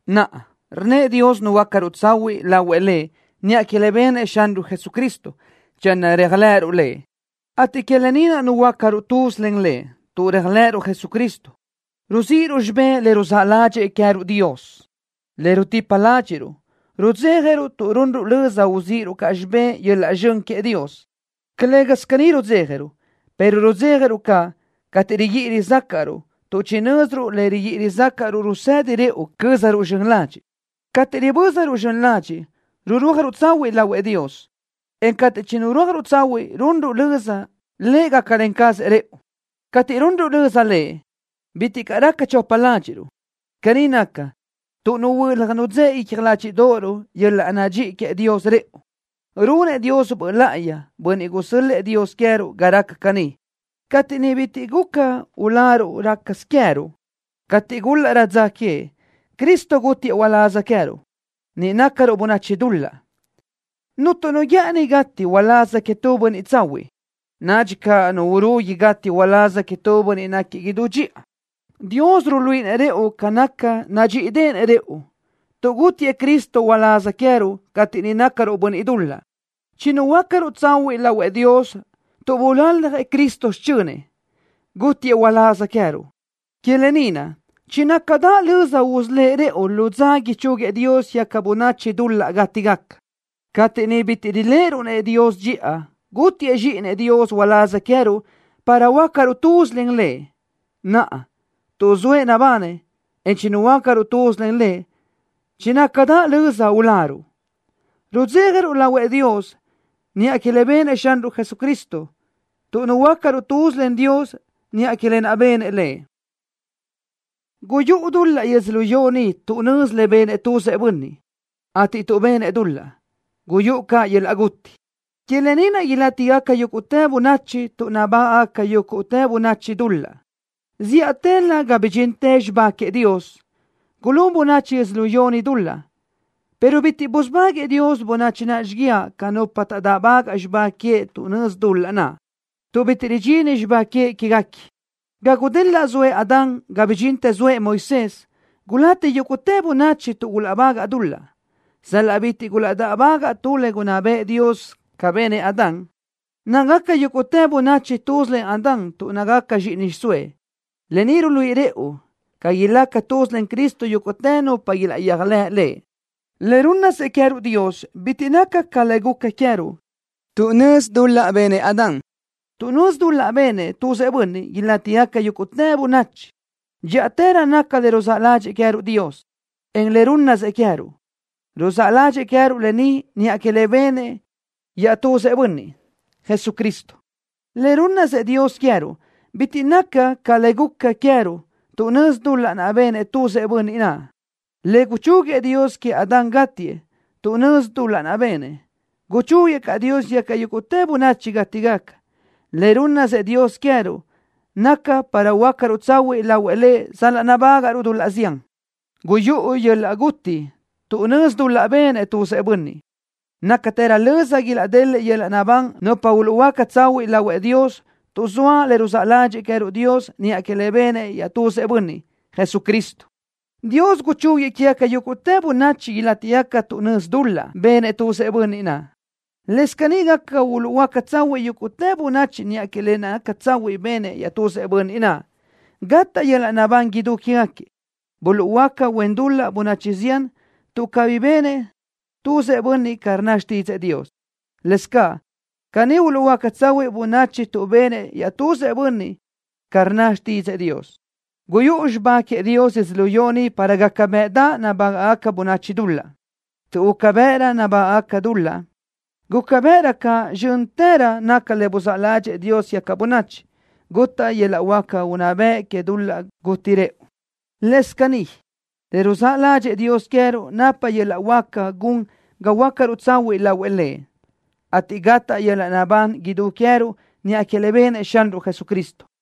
Naʼa, rnnëʼ Dios nuhuöácaruʼ tsahuiʼ lahuëʼ Lëʼ niʼa que le benëʼ Xanruʼ Jesucristo, channö réajlëʼëruʼ Lëʼ, ateʼ que lë ni naʼ nuhuöácaruʼ tuz len Lëʼ. Tuʼ réajlëʼëruʼ Jesucristo, ruzíʼiruʼ xibé le ruzáʼ ládxëʼë Dios queë́ruʼ, le rutipa ládxiʼruʼ. Rudzéjaruʼ tuʼ runruʼ löza uzíʼiruʼ caʼ xibé yöl-laʼ zxön queëʼ Dios. Calë́gasö caní rudzéjaruʼ, pero rudzéjaruʼ caʼ cateʼ riguíʼi rizácaʼruʼ, tuʼ chinö́ziruʼ le riguíʼi rizácaʼruʼ rusedi rëʼu cö́zaruʼ zxön ladxiʼ. Cateʼ ribö́zaruʼ zxön ladxiʼ rurúajruʼ tsahuiʼ lahuëʼ Dios, en cateʼ chinurúajruʼ tsahuiʼ runruʼ löza Lëʼ gácalen cazëʼ rëʼu. Cateʼ runruʼ löza Lëʼ, bitiʼ caʼ raca chopa ládxiʼruʼ. Caní naca, tuʼ nuhuö́laj nudzë́ʼe icja ládxiʼdoʼoruʼ yöl-laʼ nadxíʼi queëʼ Dios rëʼu. Runëʼ Dios Böʼ Láʼayi, Bönniʼ gusö́l-lëʼë Dios queë́ruʼ ga raca caní. Cateʼ niʼ bitiʼ caʼ guca uláruʼ rácasö queë́ruʼ, cateʼ gúlaʼrö dza queëʼ, Cristo gútiëʼ uláz queë́ruʼ, niʼ nácaruʼ bönachi dul-laʼ. Cuntu nu guë́ʼëni gati uláz queëʼ tu bönniʼ tsahuiʼ. Nadxi caʼ nu urugui gati uláz queëʼ tu bönniʼ náquiëʼ idú dxiʼa. Dios ruluíʼinëʼ rëʼu ca nadxíʼideʼenëʼ rëʼu, tuʼ gútiëʼ Cristo uláz queë́ruʼ cateʼ niʼ nácaruʼ bönniʼ dul-laʼ. Chinuhuöácaruʼ tsahuiʼ lahuëʼ Dios tuʼ bulaljëʼ Cristo xichönëʼ, gútiëʼ uláz queë́ruʼ. Que lë ni naʼ chinácadaʼ löza usölë́ʼ Lëʼ rëʼu lu dza ichúguiëʼ Dios quégaca bönachi dul-laʼ gátigaca. Cateʼ niʼ bitiʼ riléʼeruʼ-nëʼ Dios dxiʼa, gútiëʼ Zxíʼinëʼ Dios uláz queë́ruʼ para huöácaruʼ tuz len Lëʼ. Naʼa, tuʼ zoëʼ nabanëʼ, en chinuhuöácaruʼ tuz len Lëʼ, chinácadaʼ löza uláruʼ. Rudzéjaruʼ lahuëʼ Dios niʼa que le benëʼ Xanruʼ Jesucristo, tuʼ nuhuöácaruʼ tuz len Dios niʼa que lë naʼ benëʼ Lëʼ. Guyúʼu dul-laʼ yödzölió ni tuʼ nözi le benëʼ tuzëʼ bönniʼ, ateʼ tuʼ benëʼ dul-laʼ, guyúʼu caʼ yöl-laʼ guti. Que lë ni naʼ ilátigaca yúguʼtë bönachi tuʼ nabágaʼgaca yúguʼtë bönachi dul-laʼ. Zíʼatëlö ga bidxintë xibá queëʼ Dios, gulún bönachi yödzölió ni dul-laʼ, pero bitiʼ busubáguëʼë Dios bönachi naʼ xíguiaʼ ca nupa taʼdáʼbagaʼ xibá queëʼ tuʼ nözi dul-laʼ naʼ, tuʼ bitiʼ ridxini xibá queëʼ quégaquiëʼ. Ga gudelaʼ zoëʼ Adán ga bidxintë zoëʼ Moisés gulati yúguʼtë bönachi tuʼ gulaʼbagaʼ dul-laʼ, sal-laʼ bitiʼ gulaʼdáʼbagaʼ tu le gunná bëʼë Dios ca benëʼ Adán. Nácagaca yúguʼtë bönachi tuz len Adán tuʼ nácagaca zxíʼini xiʼsóëʼ. Lë ni ruluíʼi rëʼu ca ilaca tuz len Cristo yúguʼtë nupa ilaʼyéajlëʼ Lëʼ. Le rúnnasëʼ queë́ruʼ Dios bitiʼ naca ca le guca queë́ruʼ tuʼ nözi dul-laʼ benëʼ Adán. Tuʼ nözi dul-laʼ benëʼ tuzëʼ bönniʼ, ilátigaca yúguʼtë bönachi. Dxíʼatërö naca le ruzáʼ ládxëʼë queë́ruʼ Dios, en le rúnnasëʼ queë́ruʼ. Ruzáʼ ládxëʼë queë́ruʼ lë ni niʼa que le benëʼ yetuzëʼ Bönniʼ, Jesucristo. Le rúnnasëʼ Dios queë́ruʼ bitiʼ naca ca le guca queë́ruʼ tuʼ nözi dul-laʼ naʼ benëʼ tuzëʼ bönniʼ naʼ. Le guchúguiëʼ Dios queëʼ Adán gátiëʼ tuʼ nözi dul-laʼ naʼ benëʼ, guchúguiëʼ caʼ Dios quégaca yúguʼtë bönachi gátigaca. Le rúnnasëʼ Dios queë́ruʼ naca para huöácaruʼ tsahuiʼ lahuëʼ Lëʼ sal-laʼ nabágaʼruʼ dul-laʼ zián. Guyúʼu yöl-laʼ guti tuʼ nözi dul-laʼ benëʼ tuzëʼ bönniʼ. Nácatërö löza ilaʼdeliʼ yöl-laʼ naʼbán nupa uluʼhuöáca tsahuiʼ lahuëʼ Dios tuʼ zoa le ruzáʼ ládxëʼë queë́ruʼ Dios niʼa que le benëʼ yetuzëʼ Bönniʼ, Jesucristo. Dios guchúguiëʼ quégaca yúguʼtë bönachi ilátigaca tuʼ nözi dul-laʼ benëʼ tuzëʼ bönniʼ naʼ. Lëscaʼ caní gaca uluʼhuöáca tsahuiʼ yúguʼtë bönachi niʼa que le naca tsahuiʼ benëʼ yetuzëʼ Bönniʼ naʼ, gataʼ yöl-laʼ naʼbán idú quégaquiëʼ. Buluʼhuöáca huen dul-laʼ bönachi zián tuʼ cabí benëʼ tuzëʼ bönniʼ ca rnna xtídzëʼë Dios. Lëscaʼ caní uluʼhuöáca tsahuiʼ bönachi tuʼ benëʼ yetuzëʼ Bönniʼ naʼ ca rnna xtídzëʼë Dios. Guyúʼu xibá queëʼ Dios yödzölió ni para gaca bëʼdaʼ nabágaʼgaca bönachi dul-laʼ. Tuʼ guca bëʼrö nabágaʼgaca dul-laʼ, guca bëʼrö caʼ zxö́ntërö naca le buzáʼ ládxëʼë Dios quégaca bönachi. Gutaʼ yöl-laʼ huáca unná bëʼ que dul-laʼ guti rëʼu. Lëscaʼ caní le ruzáʼ ládxëʼë Dios queë́ruʼ napa yöl-laʼ huáca gun ga huöácaruʼ tsahuiʼ lahuëʼ Lëʼ, ateʼ gataʼ yöl-laʼ naʼbán idú queë́ruʼ niʼa que le benëʼ Xanruʼ Jesucristo.